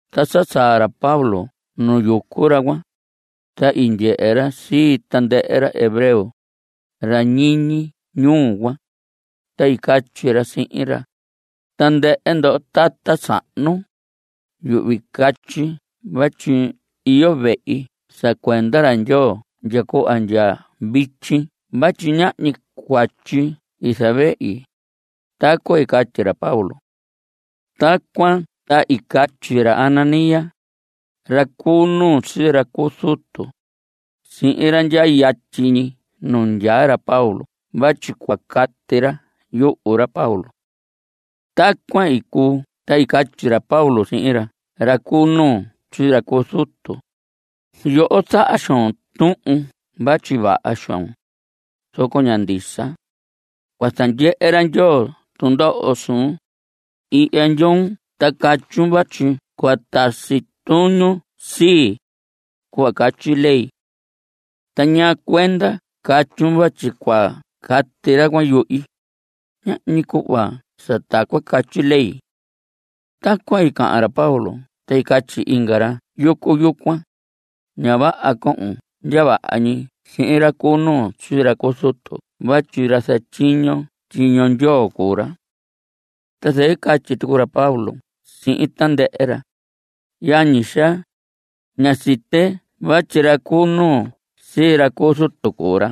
Ta sa saa ra Pablo nu yucu ra cuan, ta i ndyehe ra sii tandɨhɨ ra hebreo, ra ñiñi ñuu cuan, ta i catyi ra sihin ra: Tandɨhɨ ndoho tata sahnu, yuhvi catyi vatyi iyo vehi sa cuenda ra Ndyoo ndya cuhva ndya vityi vatyi ñahñi cuatyi i zavehi. Tacuan i catyi ra Pablo. Tacuan ta i catyi ra Ananías, ra cu nuu sii ra cu zutu, sihin ra ndyaa yatyi ñi nu nandyaa ra Pablo vatyi cua cati ra yuhu ra Pablo. Tacuan i cuu ta i catyi ra Pablo sihin ra cu nuu sii ra cu zutu: Yoho, zaha xoon tuhun vatyi vaha xoon, zoco ña ndisa. Cua zandyehe ra Ndyoo tundoho suun. Ihya ndyoon ta catyun vatyi cua tasi tuñun sii, cuhva catyi ley. Ta ¿ñaa cuenda catyun vatyi cua cati ra cuan yuhi? Ñahñi cuhva sa tacuan catyi ley. Tacuan i cahan ra Pablo ta i catyi inga ra yucu yucuan: Ña vaha cohon ndya vaha ñi sihin ra cu nuu sii ra cu zutu vatyi ra zatyiño tyiño Ndyoo cuu ra. Ta zɨquɨ i catyi tucu ra Pablo sihin tandɨhɨ ra: Yañi xaa, ñá site vatyi ra cu nuu sii ra cu zutu cuu ra.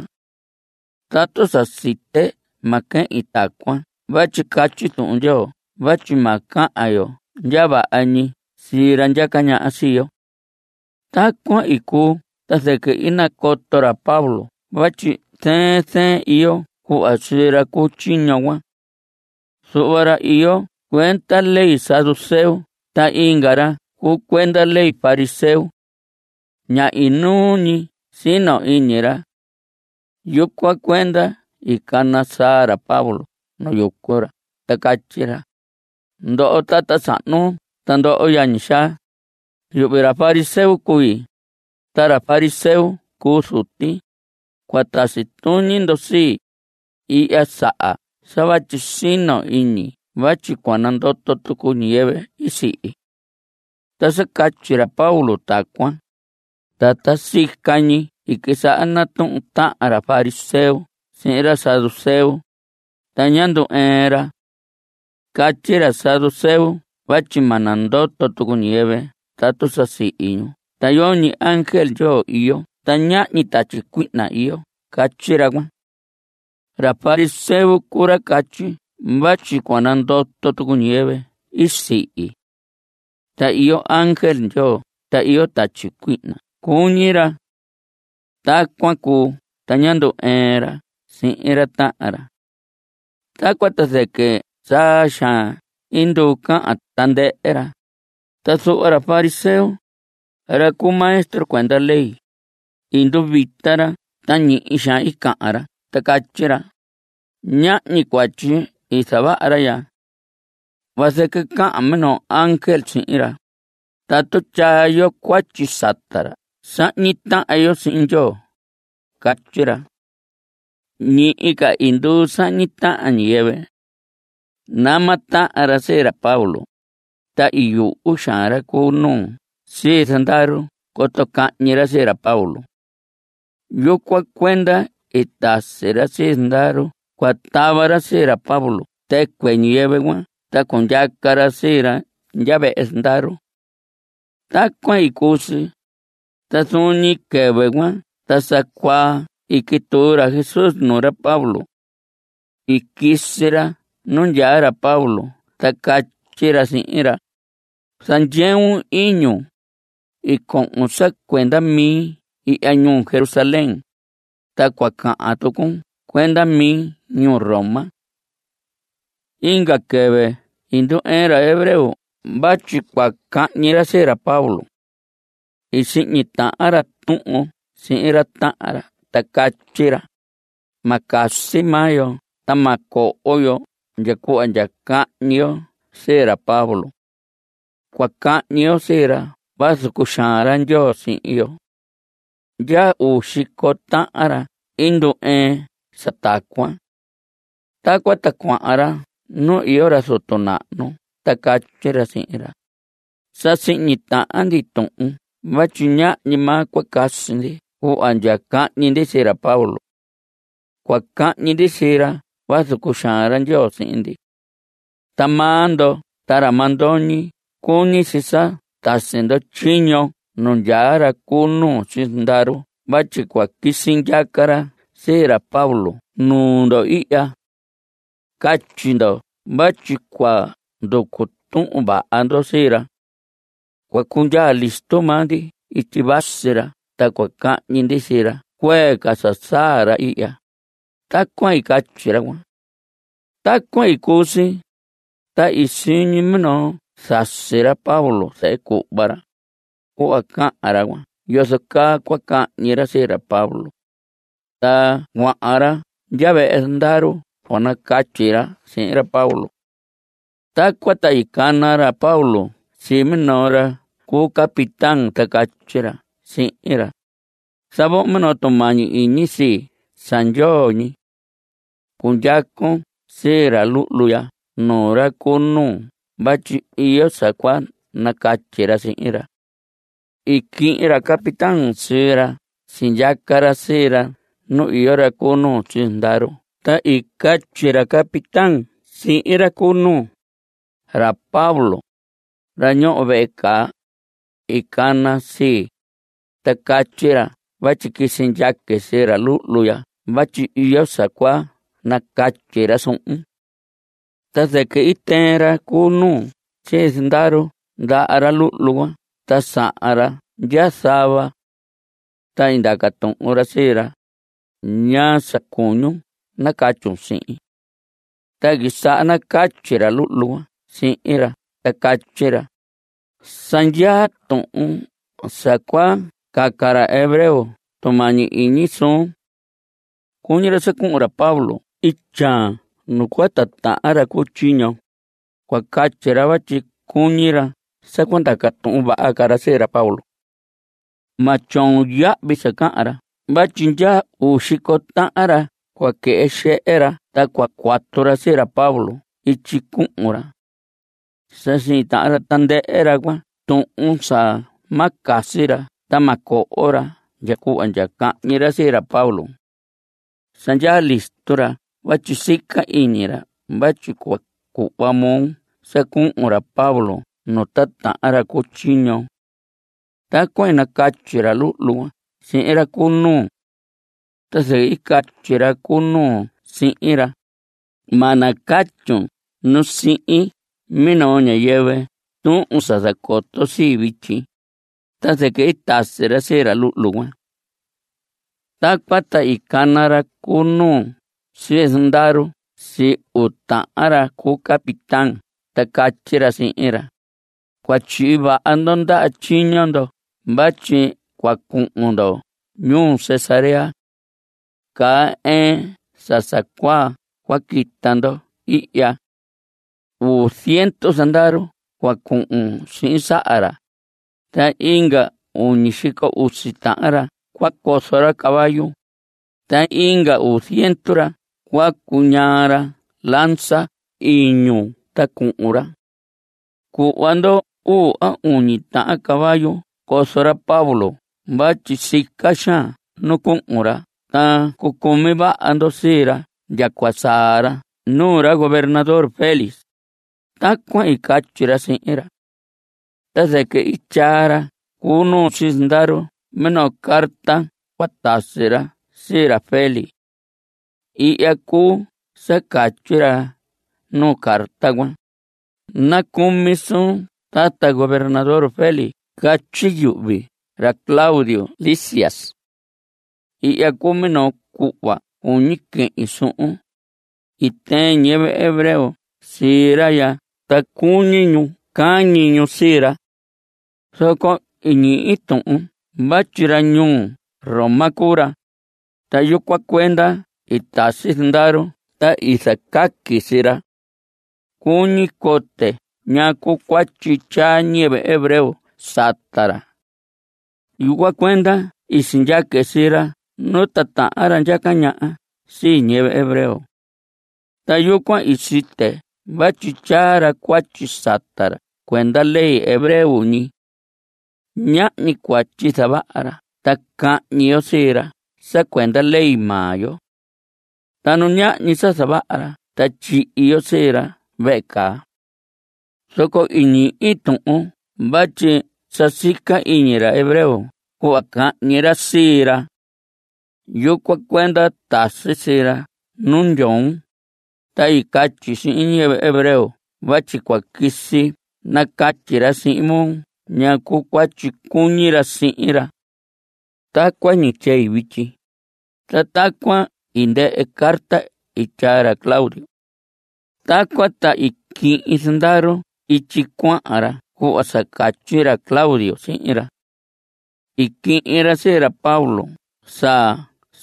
Tatu sa site ma quehin tacuan vatyi catyi Tuhun Ndyoo vatyi ma cahan yo ndya vaha ñi sihin ra ndyaca ñaha sii yo. Tacuan i cuu ta zɨquɨ i nacoto ra Pablo vatyi zɨɨn zɨɨn iyo cuhva sii ra cu tyiño cuan. Zuhva ra iyo cuenda ley saduceo ta inga ra cuu cuenda ley fariseo. Ña inuu ñi sino iñi ra. Yucuan cuenda i cana saa ra Pablo nu yucu ra ta catyi ra: Ndoho tata sahnu ta ndoho yañi xaa, yuhvi ra fariseo cui. Ta ra fariseo i cuu zuti. Cua tasi tuñi ndo sii, ihya saha sa vatyi sino iñi vatyi cua nandoto tucu ñiyɨvɨ i sihi. Ta sa catyi ra Pablo tacuan ta ta sica ñi i quisaha natuhun tahan ra fariseo sihin ra saduceo, ta ñá ndu‑ɨɨn ra. Catyi ra saduceo vatyi ma nandoto tucu ñiyɨvɨ tatu sa i sihi ñu ta yoñi ángel Ndyoo iyo ta ñahñi tatyi cuihna iyo catyi ra cuan. Ra fariseo cuu ra catyi vatyi cua nandoto tucu ñiyɨvɨ i sihi. Ta iyo ángel Ndyoo ta iyo tatyi cuihna cuñi ra. Tacuan cuu ta ñá ndu‑ɨɨn ra sihin ra tahan ra. Tacuan ta zɨquɨ saa xaan i nduu cahan tandɨhɨ ra, ta zuhva ra fariseo, ra cu maestro cuenda ley, i nduvita ra ta ñihi xaan cahan ra ta catyi ra: Ñahñi cuatyi i zavaha ra ya. Vazɨquɨ cahan minoo ángel sihin ra. Tatu tyaa yo cuatyi sata ra sahñi tahan yo sihin Ndyoo. Catyi ra. Ñihi ca i nduu sahñi tahan ñiyɨvɨ. Nama tahan ra sii ra Pablo, ta i yuhu xaan ra cu nuu sii zandaru coto cahñi ra sii ra Pablo. Yucuan cuenda i tasi ra sii zandaru cua tava sii ra Pablo tɨcuɨ ñiyɨvɨ cuan ta cundyaca ra sii ra ndya vehe zandaru. Tacuan i cuu si. Ta zuun ñi quɨvɨ cuan ta sa cuaa i quituu ra Jesús nuu ra Pablo. I quisi ra nu ndyaa ra Pablo ta catyi ra sihin ra: Zandyeun iñun. I cohon sa cuenda mi ihya ñuu Jerusalén, ta cua cahan tucun cuenda mi ñuu Roma. Inga quɨvɨ i ndu‑ɨɨn ra hebreo vatyi cua cahñi ra sii ra Pablo. I sihñi tahan ra tuhun sihin ra tahan ra ta catyi ra: Ma casi maa yo ta ma coho yo ndya cuhva ndya cahñi yo sii ra Pablo. Cua cahñi yo sii ra vazu cuxaan ra Ndyoo sii yo. Yaha uu xico tahan ra ndu‑ɨɨn sa tacuan. Tacuan ta cuahan ra nu iyo ra zutu nahnu ta catyi ra sihin ra: Sa sihñi tahan ndi tuhun vatyi ñahñi maa cua casi ndi cuhva ndya cahñi ndi sii ra Pablo. Cua cahñi ndi sii ra vazu cuxaan ra Ndyoo sii ndi. Ta maa ndo ta ra mandoñi cuñi si sa tasi ndo tyiño nu ndyaa ra cu nuu sii zandaru vatyi cua quisi ndyaca ra sii ra Pablo nuu ndo ihya. Catyi ndo vatyi cua nducu tuhun vaha ndo sii ra. Cua cundyaa listo maa ndi ityi vasi ra ta cua cahñi ndi sii ra cuee ca sa saa ra ihya. Tacuan i catyi ra cuan. Tacuan i cuu si, ta i siñi minoo zasi ra Pablo, zehe cuhva ra, cuhva cahan ra cuan yozo caa cua cahñi ra sii ra Pablo. Ta cuahan ra ndya vehe zandaru cua nacatyi ra sihin ra Pablo. Tacuan ta i cana ra Pablo sii minoo ra cu capitán ta catyi ra sihin ra: Zavohon minoo tumañi iñi sii sa ndyoo ñi. Cundyacon sii ra luhlu ya nuu ra cu nuu vatyi iyo sa cua nacatyi ra sihin ra. I quihin ra capitán sii ra sindyaca ra sii ra nu iyo ra cu nuu sii zandaru ta i catyi ra capitán sihin ra cu nuu: Ra Pablo, ra ñoho vehe caa, i cana sii, ta catyi ra vatyi quisi ndyaque sii ra luhlu ya vatyi iyo sa cua nacatyi ra suhun. Ta zɨquɨ i tɨɨn ra cu nuu sii zandaru ndaha ra luhlu cuan ta sahan ra ndya zava. Ta i ndaca tuhun ra sii ra: ¿Ñaa sa cuñun nacatyun sihin? Ta i quisaha nacatyi ra luhlu cuan sihin ra ta catyi ra: Sa ndyaa tuhun sa cua caca ra hebreo tumañi iñi suun. Cuñi ra sa cuhun ra Pablo ityaan nu cua titahan ra cu tyiño. Cua catyi ra vatyi cuñi ra sa cua ndaca tuhun vaha ca ra sii ra Pablo. Ma tyoon yahvi sa cahan ra vatyi yaha uu xico tahan ra cua quɨhɨ xehe ta cua cuatu ra sii ra Pablo ityi cuhun ra. Sa sihñi tahan tandɨhɨ ra tuhun sa ma casi ra ta ma coho ra ndya cuhva ndya cahñi ra sii ra Pablo. Sa ndyaa listo ra vatyi sica iñi ra vatyi cua cuhva moo sa cuhun ra Pablo nu titahan ra cu tyiño. Tacuan i nacatyi ra luhlu cuan sihin ra cu nuu. Ta zɨquɨ i catyi ra cu nuu sihin ra: Ma nacatyun nu sihin minoo ñiyɨvɨ tuhun sa zacoton sii vityi. Ta zɨquɨ i natasi ra sii ra luhlu cuan. Tacuan ta i cana ra cu nuu sii zandaru sii uu tahan ra cu capitán ta catyi ra sihin ra: Cua tyihi vaha ndo ndaha tyiño ndo vatyi cua cuhun ndo ñuu Cesarea. Caa ɨɨn sa sa cuaa cua quita ndo ihya. Uu ziendu zandaru cua cuhun sihin saha ra, inga uñi xico usi tahan ra cua cozo ra caballo, ta inga uu ziendu ra cua cuñaa ra lanza iñu ta cuhun ra. Cuhva ndo uu a uñi tahan caballo cozo ra Pablo vatyi sica xaan nu cuhun ra ta cucumi vaha ndo sii ra ndya cua saa ra nuu ra gobernador Félix. Tacuan i catyi ra sihin ra. Ta zɨquɨ i tyaa ra cu nuu sii zandaru minoo carta cua tasi ra sii ra Félix. Ihya cuu sa catyi ra nuu carta cuan: “Nacumi suun tata gobernador Félix catyi yuhvi ra Claudio Lisias. Ihya cuu minoo cuhva cuñi quehin suhun. I tɨɨn ñiyɨvɨ hebreo sii ra ya ta cuñi ñu cahñi ñu sii ra. Zoco i ñihi tuhun vatyi ra ñuu Roma cuu ra, ta yucuan cuenda i tasi zandaru ta i zacaqui sii ra. Cuñi cote ñaa cuu cuatyi tyaa ñiyɨvɨ hebreo sata ra. Yucuan cuenda i sindyaque sii ra nu titahan ra ndyaca ñaha sii ñiyɨvɨ hebreo. Ta yucuan i site vatyi tyaa ra cuatyi sata ra cuenda ley hebreo ñi. Ñahñi cuatyi zavaha ra ta cahñi yo sii ra sa cuenda ley maa yo. Ta nu ñahñi sa zavaha ra ta tyihi yo sii ra vehe caa. Zoco i ñihi tuhun vatyi sa sica iñi ra hebreo cuhva cahñi ra sii ra. Yucuan cuenda tasi sii ra nu ndyoon, ta i catyi sihin ñiyɨvɨ hebreo vatyi cua quisi nacatyi ra sihin moo ñaa cuu cuatyi cuñi ra sihin ra. Tacuan ñi tyei vityi.” Ta tacuan i ndɨhɨ carta i tyaa ra Claudio. Tacuan ta i quihin zandaru ityi cuahan ra cuhva sa catyi ra Claudio sihin ra. I quihin ra sii ra Pablo sa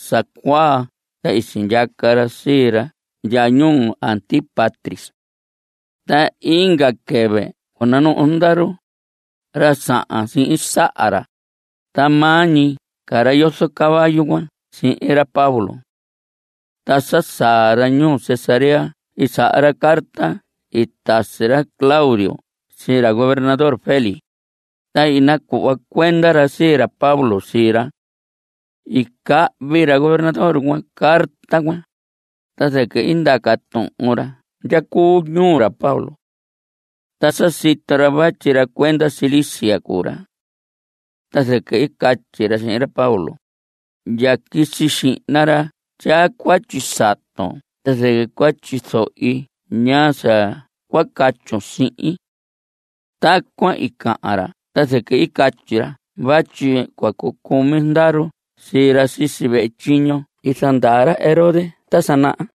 sa cuaa ta i sindyaca ra sii ra ndya ñuu Antípatris. Ta inga quɨvɨ cua nanuhu zandaru, ra sahan sihin saha ra, ta maa ñi ca ra yozo caballo cuahan sihin ra Pablo. Ta sa saa ra ñuu Cesarea i saha ra carta i tasi ra Claudio sii ra gobernador Félix, ta i nacuhva cuenda ra sii ra Pablo sii ra. I cahvi ra gobernador cuan carta cuan. Ta zɨquɨ i ndaca tuhun ra ndya cuu ñuu ra Pablo. Ta sa sito ra vatyi ra cuenda Cilicia cuu ra. Ta zɨquɨ i catyi ra sihin ra Pablo: Ndya quisi xihna ra tyaa cuatyi saton ta zɨquɨ cua tyizohi ñaa sa cua catyun sihin. Tacuan i cahan ra ta zɨquɨ i catyi ra vatyi cua cucumi zandaru sii ra sisi vehe tyiño i zandaa ra Herodes ta sa naha.